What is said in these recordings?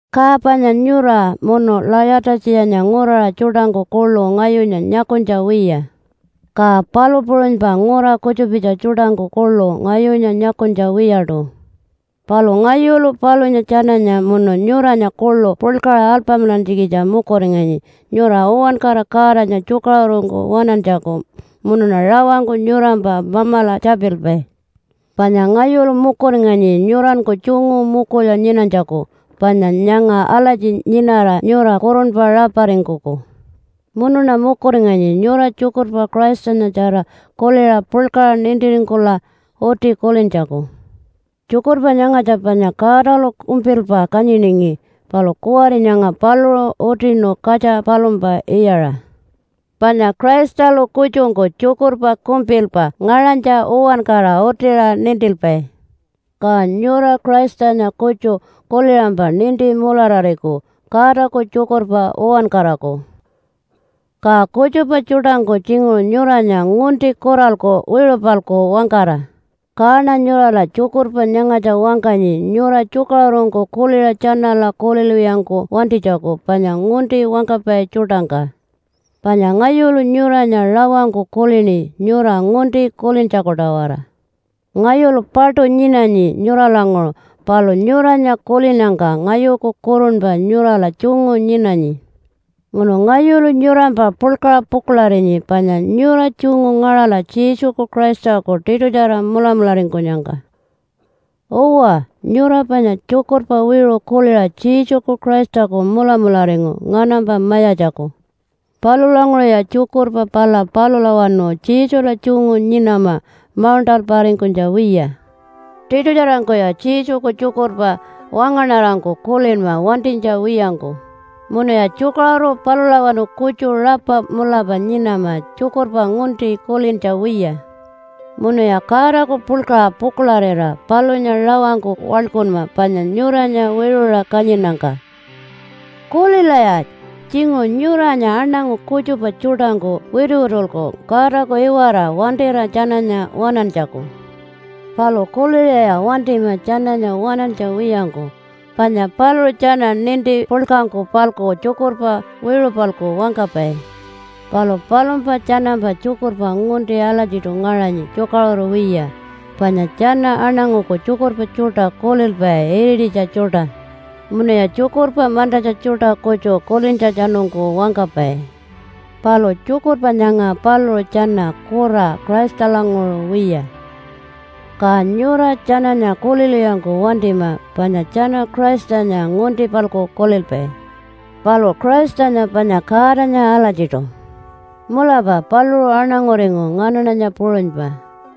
Ka panya nyura munu Layata-tjiyanya nguraṟa tjuṯangku kuḻu ngayunya nyakunytja wiya. Ka palu puṟunypa ngura kutjupitja tjuṯangku kuḻu ngayunya nyakunytja wiyaṯu. Palu ngayulu palunya tjananya munu nyuranya kuḻu puḻkaṟa alpamilantjikitja mukuringanyi nyura uwankara Godanya tjukaṟurungku waṉantjaku munuṉa rawangku nyurampa Mamala tjapilpai. Panya ngayulu mukuringanyi nyuranku tjungu mukulya nyinanytjaku panya nyanga alatji nyinara nyura kurunpa raparingkuku. Munuṉa mukuringanyi nyura tjukurpa Christanyatjara kuliṟa puḻkaṟa nintiringkula uti kulintjaku. Tjukurpa nyangatja panya Godalu kumpilpa kanyiningi palu kuwari nyanga paluṟu utinu katja palumpa iyaṟa. Panya Christalu kutjungku tjukurpa kumpilpa ngaṟanytja uwankara utiṟa nintilpai. Ka nyura Christanya kutju kuliṟampa ninti mularariku Godaku tjukurpa uwankaraku. Ka kutjupa tjuṯangku tjinguṟu nyuranya ngunti kuralku wiṟu-palku wangkara, kaṉa nyurala tjukurpa nyangatja wangkanyi nyura tjukaṟurungku kuliṟa tjanala kulilwiyangku wantinytjaku panya ngunti wangkapai tjuṯangka. Panya ngayulu nyuranya rawangku kulini nyura ngunti kulintjaku-tawara. Ngayulu paṯu nyinanyi nyuralanguṟu palu nyuranya kulinnyangka ngayuku kurunpa nyurala tjungu nyinanyi. Munu ngayulu nyurampa puḻkaṟa pukuḻarinyi panya nyura tjungu ngaṟala Jesuku Christaku tiṯutjara mulamularingkunyangka. Uwa, nyura panya tjukurpa wiṟu kuliṟa Jesuku Christaku mulamularingu nganampa Mayatjaku. Palulanguṟuya tjukurpa pala palulawanu Jesula tjungu nyinama mauṉṯalparingkunytja wiya. Tiṯutjarangkuya Jesuku tjukurpa wangaṉarangku kulinma wantinytja wiyangku, munuya tjukaṟuru palulawanu kutju rapa mulapa nyinama tjukurpa ngunti kulintja wiya. Munuya Godaku puḻkaṟa pukuḻarira palunya rawangku waḻkunma panya nyuranya wiṟuṟa kanyinnyangka. Kulilaya! Tjinguṟu nyuranya aṉangu kutjupa tjuṯangku wituwitulku Godaku iwara wantira tjananya waṉantjaku. Palu kuliṟaya wantima tjananya waṉantja wiyangku, panya paluṟu tjana ninti puḻkangku-palku tjukurpa wiṟu-palku wangkapai. Palu palumpa tjanampa tjukurpa ngunti alatjiṯu ngaṟanyi tjukaṟuru wiya, panya tjana aṉanguku tjukurpa tjuṯa kulilpai irititja tjuṯa, munuya tjukurpa mantatja tjuṯa kutju kulintjatjanungku wangkapai. Palu tjukurpa nyanga paluṟu tjana kura Christalanguṟu wiya. Ka nyura tjananya kulilwiyangku wantima, panya tjana Christanya ngunti-palku kulilpai. Palu Christanya panya Godanya alatjiṯu. Mulapa paluṟu aṉanguringu nganaṉanya puṟunypa,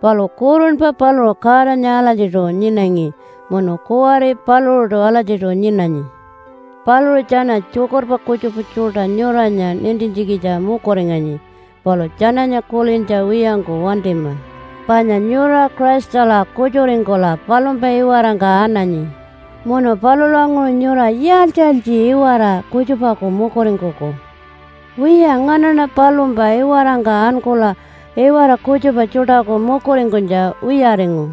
palu kurunpa paluṟu Godanya alatjiṯu nyinangi, munu kuwari paluṟuṯu alatjiṯu nyinanyi. Paluṟu tjana tjukurpa kutjupa tjuṯa nyuranya nintintjikitja mukuringanyi, palu tjananya kulintja wiyangku wantima, panya nyura Christala kutjuringkula palumpa iwarangka ananyi munu palulanguṟu nyura yaaltji-yaaltji iwara kutjupaku mukuringkuku? Wiya nganaṉa palumpa iwarangka ankula iwara kutjupa tjuṯaku mukuringkunytja wiyaringu,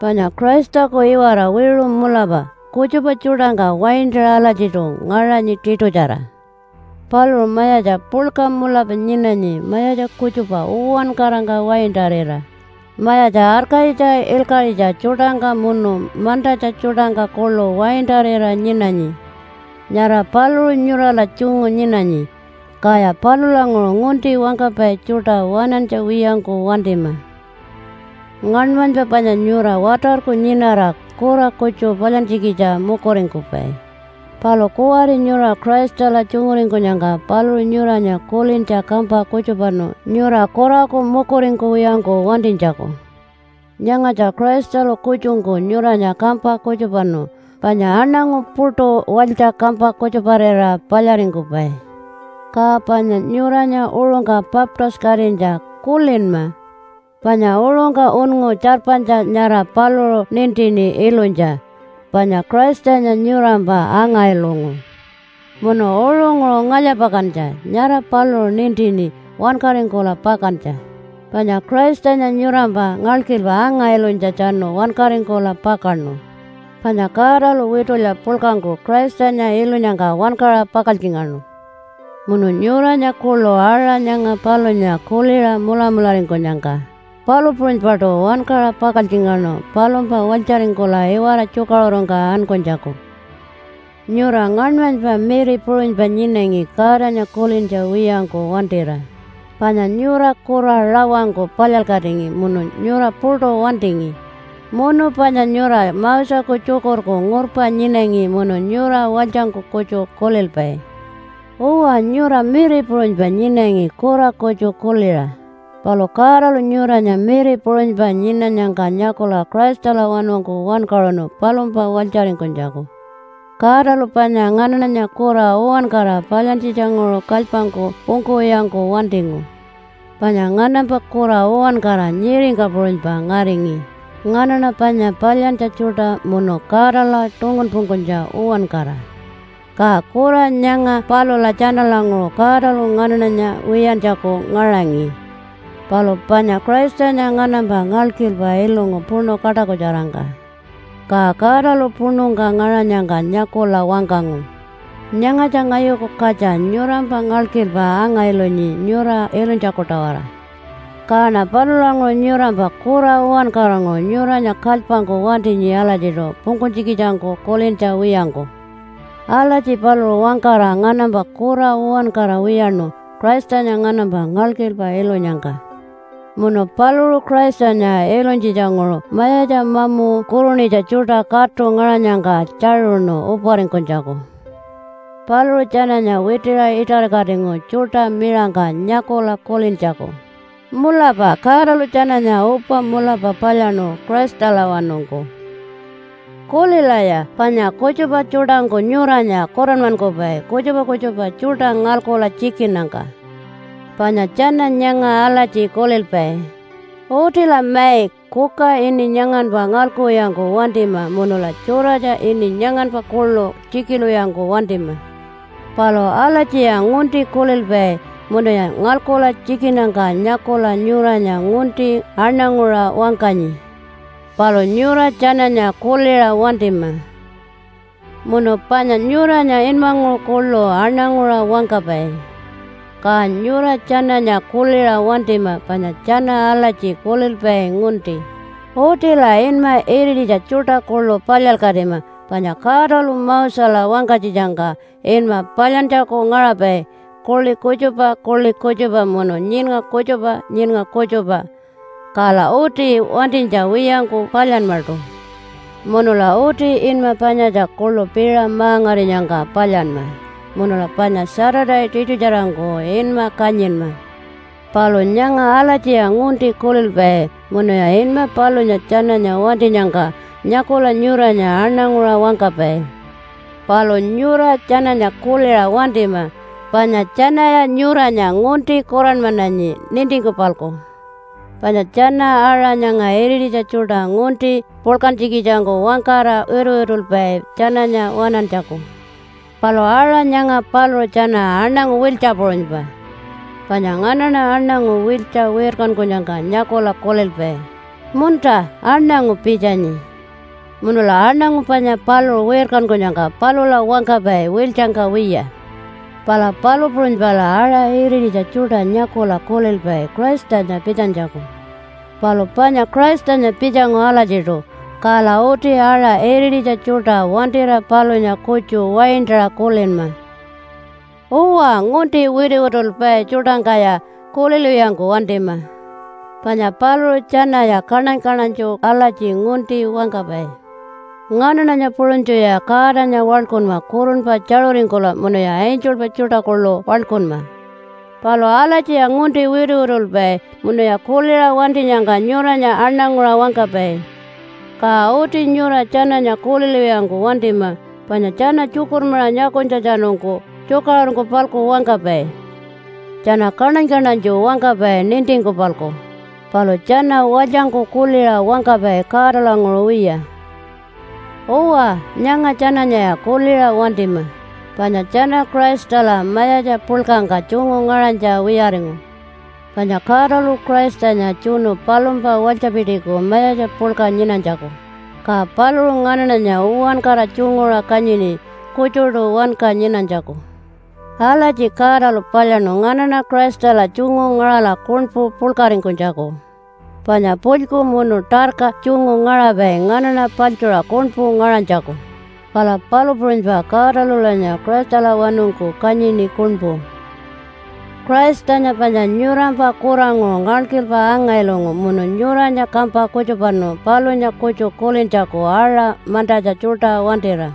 panya Christaku iwara wiṟu mulapa kutjupa tjuṯangka waintaṟa alatjiṯu ngaṟanyi tiṯutjara. Paluṟu mayatja puḻka mulapa nyinanyi mayatja kutjupa uwankarangka waintarira, mayatja arkayitja ilkaṟitja tjuṯangka munu mantatja tjuṯangka kuḻu waintarira nyinanyi. Nyara paluṟu nyurala tjungu nyinanyi. Kaya palulanguṟu ngunti wangkapai tjuṯa waṉantja wiyangku wantima. Ngaṉmanypa panya nyura watarku nyinara kura kutju palyantjikitja mukuringkupai. Palu kuwari nyura Christala tjunguringkunyangka paluṟu nyuranya kulintja kampa kutjupanu nyura kuraku mukuringkuwiyangku wantinytjaku. Nyangatja Christalu kutjungku nyuranya kampa kutjupanu, panya aṉangu puṯu walytja kampa kutjuparira palyaringkupai. Ka panya nyuranya uṟungka baptise-katinytja kulinma! Panya uṟungka unngu tjarpanytja nyara paluṟu nintini ilunytja, panya Christanya nyurampa anga-ilungu. Munu uṟunguṟu ngalya-pakantja nyara paluṟu nintini wankaringkula pakantja, panya Christanya nyurampa ngalkilpa anga-ilunytjatjanu wankaringkula pakaṉu. Panya Godalu witulya puḻkangku Christanya ilunyangka wankaṟa pakaltjingaṉu, munu nyuranya kuḻu aṟa nyanga palunya kuliṟa mulamularingkunyangka palu puṟunypaṯu wankaṟa pakaltjingaṉu palumpa walytjaringkula iwara tjukaṟurungka ankunytjaku. Nyura ngaṉmanypa miri puṟunypa nyinangi Godanya kulintja wiyangku wantira, panya nyura kura rawangku palyalkatingi munu nyura puṯu wantingi, munu panya nyura Moseku tjukurku ngurpa nyinangi munu nyura walytjangku kutju kulilpai. Uwa nyura miri puṟunypa nyinangi kura kutju kuliṟa, palu Godalu nyuranya miri puṟunypa nyinanyangka nyakula Christalawanungku wankaṟunu palumpa walytjaringkunytjaku. Godalu panya nganaṉanya kura uwankara palyantjitjanguṟu kalypangku pungkuwiyangku wantingu. Panya nganampa kura uwankara nyiringka puṟunypa ngaringi nganaṉa panya palyantja tjuṯa munu Godala tungunpungkunytja uwankara. Ka kura nyanga palula tjanalanguṟu Godalu nganaṉanya wiyantjaku ngaṟangi. Palu panya Christanya nganampa ngalkilpa ilungu puṉu kaṯakutjarangka. Ka Godalu puṉungka ngaṟanyangka nyakula wangkangu, “Nyangatja ngayuku katja nyurampa ngalkilpa anga-ilunyi nyura ilunytjaku-tawara. Kaṉa palulanguṟu nyurampa kura uwankaranguṟu nyuranya kalypangku wantinyi alatjiṯu pungkunytjikitjangku kulintja wiyangku.” Alatji paluṟu wangkara nganampa kura uwankara wiyaṉu Christanya nganampa ngalkilpa ilunyangka. Munu paluṟu Christanya ilunytjitjanguṟu mayatja mamu kurunitja tjuṯa katu ngaṟanyangka tjaṟuṉu uparingkunytjaku. Paluṟu tjananya witiṟa iṯarikatingu tjuṯa miṟangka nyakula kulintjaku, “Mulapa Godalu tjananya upa mulapa palyaṉu Christalawanungku.” Kulilaya! Panya kutjupa tjuṯangku nyuranya kuranmankupai kutjupa kutjupa tjuṯa ngalkula tjikinnyangka. Panya tjana nyanga alatji kulilpai, “Utila mai, kuka ini nyanganpa ngalkuwiyangku wantima munula tjuratja ini nyanganpa kuḻu tjikilwiyangku wantima.” Palu alatjiya ngunti kulilpai munuya ngalkula tjikinnyangka nyakula nyuranya ngunti aṉanguṟa wangkanyi. Palu nyura tjananya kuliṟa wantima. Munu panya nyuranya inmanguṟu kuḻu aṉanguṟa wangkapai. Ka nyura tjananya kuliṟa wantima panya tjana alatji kulilpai ngunti, “Utila inma irititja tjuṯa kuḻu palyalkatima panya Godalu Mosela wangkanytjitjangka inma palyantjaku ngaṟapai kuḻi kutjupa kuḻi kutjupa munu nyiṉnga kutjupa nyiṉnga kutjupa, kala uti wantinytja wiyangku palyanmaṯu. Munula uti inma panyatja kuḻu piṟa ma-ngarinyangka palyanma, munula panya Saturday tiṯutjarangku inma kanyinma.” Palu nyanga alatjiya ngunti kulilpai munuya inma palunya tjananya wantinyangka nyakula nyuranya aṉanguṟa wangkapai. Palu nyura tjananya kuliṟa wantima panya tjanaya nyuranya ngunti kuranmananyi nintingku-palku. Panya tjana aṟa nyanga irititja tjuṯa ngunti puḻkantjikitjangku wangkara wituwitulpai tjananya waṉantjaku. Palu aṟa nyanga paluṟu tjana aṉangu wiltja puṟunypa. Panya nganaṉa aṉangu wiltja wirkankunyangka nyakula kulilpai, “Munta, aṉangu pitjanyi.” Munula aṉangu panya paluṟu wirkankunyangka palula wangkapai wiltjangka wiya. Pala palu puṟunypala aṟa irititja tjuṯa nyakula kulilpai Christanya pitjanytjaku. Palu panya Christanya pitjangu alatjiṯu, kala uti aṟa irititja tjuṯa wantira palunya kutju waintaṟa kulinma. Uwa, ngunti wituwitulpai tjuṯangkaya kulilwiyangku wantima! Panya paluṟu tjanaya kaṉany-kaṉanytju alatji ngunti wangkapai, “Nganaṉanya puṟunytjuya Godanya waḻkunma kurunpa tjaṟuringkula, munuya angelpa tjuṯa kuḻu waḻkunma!” Palu alatjiya ngunti wituwitulpai, munuya kuliṟa wantinyangka nyuranya aṉanguṟa wangkapai. Ka uti nyura tjananya kulilwiyangku wantima, panya tjana tjukurmaṟa nyakunytjatjanungku tjukaṟurungku-palku wangkapai. Tjana kaṉany-kaṉanytju wangkapai nintingku-palku, palu tjana walytjangku kuliṟa wangkapai Godalanguṟu wiya. Uwa, nyanga tjananyaya kuliṟa wantima, panya tjana Christala mayatja puḻkangka tjungu ngaṟanytja wiyaringu. Panya Godalu Christanya tjunu palumpa walytjapitiku mayatja puḻka nyinanytjaku, ka paluṟu nganaṉanya uwankara tjunguṟa kanyini kutjuṯu wanka nyinanytjaku. Alatji Godalu palyaṉu nganaṉa Christala tjungu ngaṟala kuṉpu puḻkaringkunytjaku. Panya pulyku munu tarka tjungu ngaṟapai nganaṉa paḻtjuṟa kuṉpu ngaṟanytjaku, pala palu puṟunypa Godalulanya Christalawanungku kanyini kuṉpu. Christanya panya nyurampa kuranguṟu ngalkilpa anga-ilungu munu nyuranya kampa kutjupanu palunya kutju kulintjaku aṟa mantatja tjuṯa wantira.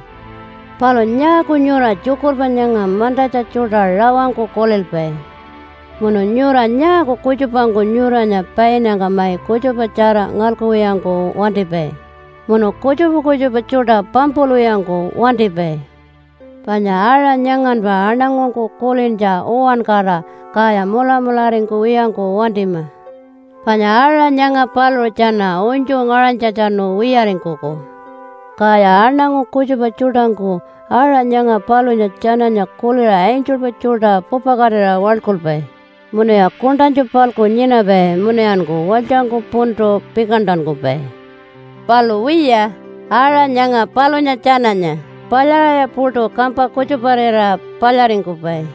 Palu nyaaku nyura tjukurpa nyanga mantatja tjuṯa rawangku kulilpai? Munu nyura nyaaku kutjupangku nyuranya painnyangka mai kutjupatjara ngalkuwiyangku wantipai, munu kutjupa kutjupa tjuṯa pampulwiyangku wantipai? Panya aṟa nyanganpa aṉangungku kulintja uwankara, kaya mulamularingkuwiyangku wantima. Panya aṟa nyanga paluṟu tjana unytju ngaṟanytjatjanu wiyaringkuku. Kaya aṉangu kutjupa tjuṯangku aṟa nyanga palunya tjananya kuliṟa angelpa tjuṯa pupakatira waḻkulpai, munuya kuṉṯanytju-palku nyinapai, munuyanku walytjangku puntu pikantankupai. Palu wiya, aṟa nyanga palunya tjananya palyaṟaya puṯu kampa kutjuparira palyaringkupai.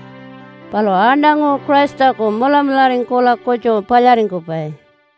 Palu aṉangu Christaku mulamularingkula kutju palyaringkupai.